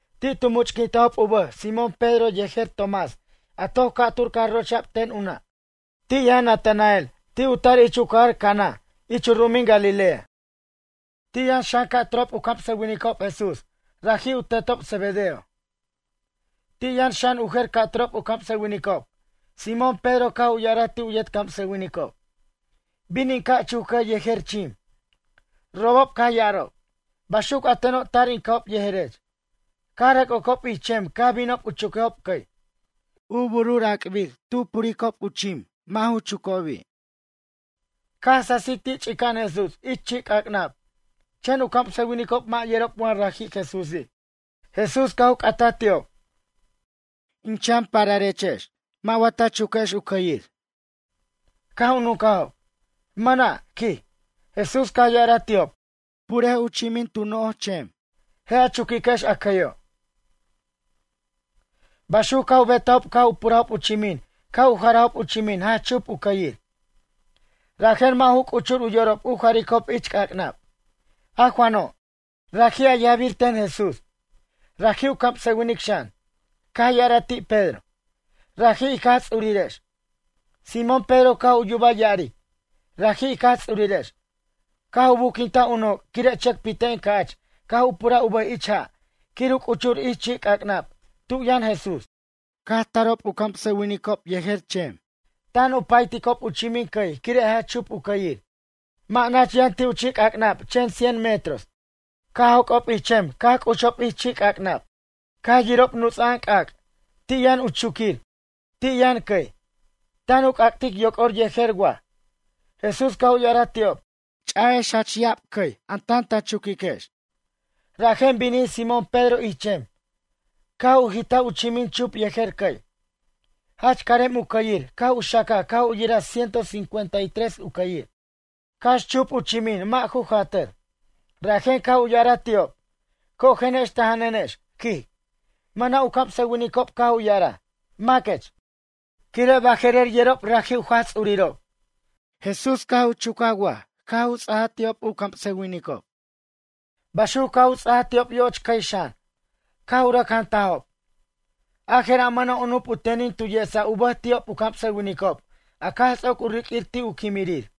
Ti' tu much'quintajob u bʌj Simón Pedro yejer Tomás a toc ca'tur caj rocha'b ten u nʌ'. Ti' yʌn Natanael ti' u tar ich u cajar Cana ich u ru'umin Galilea. Ti' yʌn xan ca'turob u camsʌwinicob Jesús raji' u tetob Zebedeo. Ti' yʌn xan u jer ca'turob u camsʌwinicob. Simón Pedro caj u ya'araj ti' u yet camsʌwinicob: ―Bin in ca' chuc cʌy yejer chim. Robob caj ya'arob: ―Baxuc a tenob tar in ca'ob yejerech. Caj rʌc ocob ich chem caj binob u chuquejob cʌy. U burur ac'bir tu puricob u chimin, mʌ' ju chucobi'. Caj sasij ti' ch'ica'an Jesús ich chi' c'ac'nab chen u camsʌwinicob mʌ' yerob wa raji' Jesúsi'. Jesús caj u c'ataj ti'ob: ―Chichanechex, mʌ' wa ta chuquex u cʌyir? Caj u nuncajob: ―Mʌna' ―quij. Jesús caj ya'araj ti'ob: ―Purej u chimin tu no'oj chem. Je' a chuquiquex a cʌyo'. Baxuc caj u betajob caj u purajob u chimin caj u jarajob u chimin jach chup u cʌyir. Rajen mʌ' ju c'uchur u yorob u jaricob ich c'ac'nab. A Juano', raji' a yajbir ten Jesús. Raji' u camsʌwinic xan, caj ya'araj ti' Pedro: ―Raji' ic Jaj Ts'urirex. Simón Pedro caj u yubaj ya'aric, “Raji' ic Jaj Ts'urirex”, caj u buquintaj u noc' quire' chʌcpiten ca'ch caj u puraj u bʌj ich ja' quir u c'uchur ich chi' c'ac'nab tu' yʌn Jesús. Caj tarob u camsʌwinicob yejer chem, tan u payticob u chimin cʌy quire' jach chup u cʌyir. Mʌ' nach yʌn ti' u chi'c'ac'nab chen cien metros. Caj joc'ob ich chem caj c'uchob ich chi'c'ac'nab. Caj yirob nuts'a'an c'ac'. Ti' yʌn u chuquir, ti' yʌn cʌy, tan u c'ac'tic yoc'or yejer waj. Jesús caj u ya'araj ti'ob: ―Ch'ayex cʌy jach ya'ab a tan ta chuquiquex. Rajen binij Simón Pedro ich chem. Caj u jitaj u chimin chup yejer cʌy. Jach carem u cʌyir caj u xacaj caj u yiraj ciento cincuenta y tres u cʌyir. Cax chup u chimin mʌ' ju jatʌr. Rajen caj u ya'araj ti'ob: ―Cojenex ta jananex ―quij. Mʌna' u camsʌwinicob caj u ya'araj: “Maquech”, quire' baje'rer yerob raji' u Jaj Ts'urirob. Jesús caj u chucaj waj caj u ts'aj ti'ob u camsʌwinicob. Baxuc caj u ts'aj ti'ob yoch cʌy xan. Caj u rʌc jantajob. A jera' mʌna' u nup u tenin tu yesa u bʌj ti'ob u camsʌwinicob a caj ts'oc u riq'uir ti' u quimirir.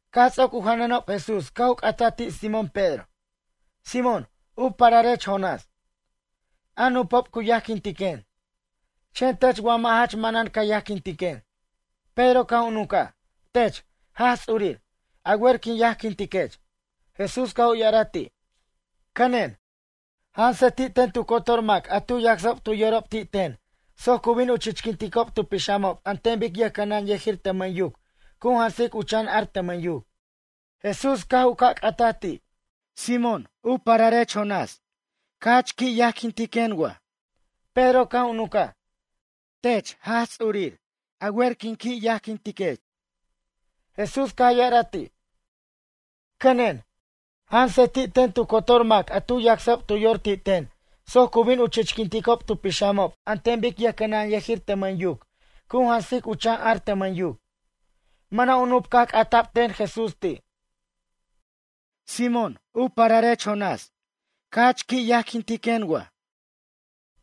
Caj ts'oc u janʌnob Jesús caj u c'ata ti' Simón Pedro: ―Simón, u pararech Jonás. A nupob cu yajquintiquen, chen tech wa jach manan ca yajquintiquen? Pedro caj u nuncaj: ―Tech, Jaj Ts'urir, a wer quin yajquintiquech. Jesús caj u ya'araj ti': ―Cʌnen, jansej ti' ten tu cotor mac a tu yacsob tu yorob ti' ten soc cu bin u chichquinticob tu pixamob an ten bic yʌjcʌnʌnyʌjir tʌmʌn yuc cu jansic u chan ar tʌmʌn yuc. Jesús caj u ca' c'ataj ti': ―Simón, u pararech Jonás, jach qui' wa ca yajquintiquen? Pedro caj u nuncaj: ―Tech, Jaj Ts'urir, a wer in qui' yajquintiquech. Jesús caj ya'araj ti': ―Cʌnen, jansej ti' ten tu cotor mac a tu yacsob tu yorob ti' ten soc cu bin u chichquinticob tu pixamob an ten bic yʌjcʌnʌnyʌjir tʌmʌn yuc cu jansic u chan ar tʌmʌn yuc. Mʌna' u nup caj c'ata'b ten Jesús ti': ―Simón, u pararech Jonás, ca jach qui' wa ca yajquintiquen?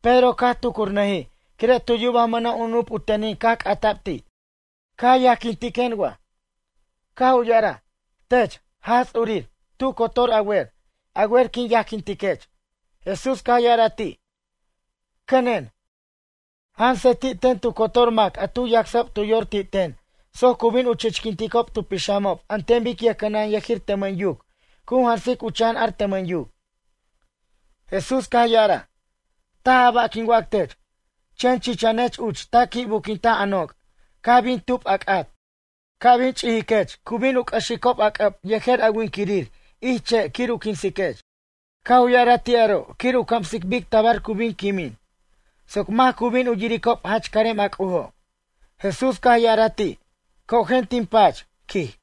Pedro caj tucurnʌjij quire' tu yubaj mʌna' u nup u tenin caj c'ata'b ti': “Ca yajquintiquen wa?” Caj u ya'araj: ―Tech, Jaj Ts'urir, tu cotor a wer. A wer quin yajquintiquech. Jesús caj ya'araj ti': ―Cʌnen, jansej ti' ten tu cotor mac a tu yacsob tu yor ti' ten soc cu bin u chichquinticob tu pixamob an ten bic yʌjcʌnʌnyʌjir tʌmʌn yuc cu jansic u chan ar tʌmʌn yuc. Jesús caj ya'araj: ―Taj a ba' quin wac tech. Chen chichanech uch ta qui' buquintaj a noc' caj bin tub a c'at. Ca' bin ch'ijiquech cu bin u c'ʌxicob a c'ʌb yejer a winquirir ich che' quir u quinsiquech. Caj u ya'araj ti' aro' quir u camsic bic tabar cu bin quimin soc mac cu bin u yiricob jach carem a C'ujo'. Jesús caj ya'araj ti': ―Cojen tin pach ―quij.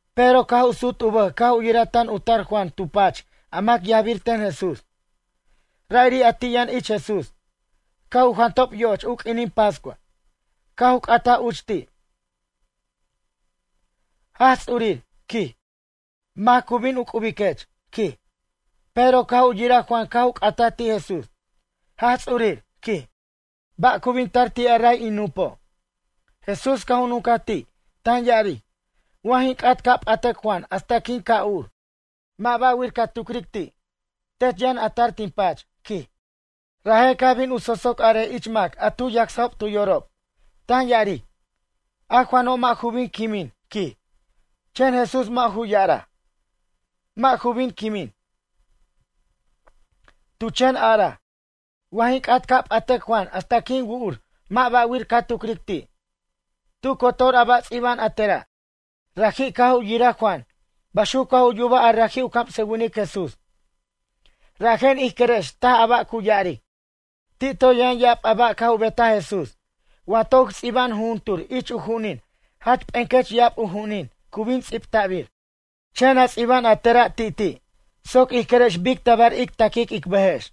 Pedro caj u sut u bʌj caj u yiraj tan u tar Juan tu pach a mac yajbir ten Jesús, ra'iri' a ti' yʌn ich Jesús caj u jantob yoch u q'uinin pascua, caj u c'ataj uch ti': “Jaj Ts'urir, quij, mac cu bin u c'ubiquech?” quij. Pedro caj u yiraj Juan caj u c'ataj ti' Jesús: ―Jaj Ts'urir ―quij―, ba' cu bin tar ti' a ray in nupo'? Jesús caj u nuncaj ti', tan ya'aric: ―Wa jin c'at ca' p'atac Juan hasta quin ca' ur, mʌ' ba'wir ca tucric ti'. Tech yʌn a tar tin pach ―quij. Rajen caj bin u sosoc arej ich mac a tu yacsob tu yorob, tan ya'aric: ―A Juano' mʌ' ju bin quimin ―quij. Chen Jesús mʌ' ju ya'araj: “Mʌ' ju bin quimin.” Tu chen araj: “Wa jin c'at ca' p'atac Juan hasta quin wu'ur mʌ' ba'wir ca tucric ti'.” Tu cotor a ba' ts'iba'an a tera', raji' caj u yiraj Juan, baxuc caj u yubaj a raji' u camsʌwinic Jesús. Rajen ij querex taj a ba' cu ya'aric. Ti' toy yʌn ya'ab ba' caj u betaj Jesús. Wa toc ts'iba'an jujuntur ich u ju'unin jach p'ecʌch ya'ab u ju'unin cu bin ts'ibta'bir. Chen a ts'iba'an a tera' ti'ti' soc ij querex bic tabar ic taquic ic bʌjex.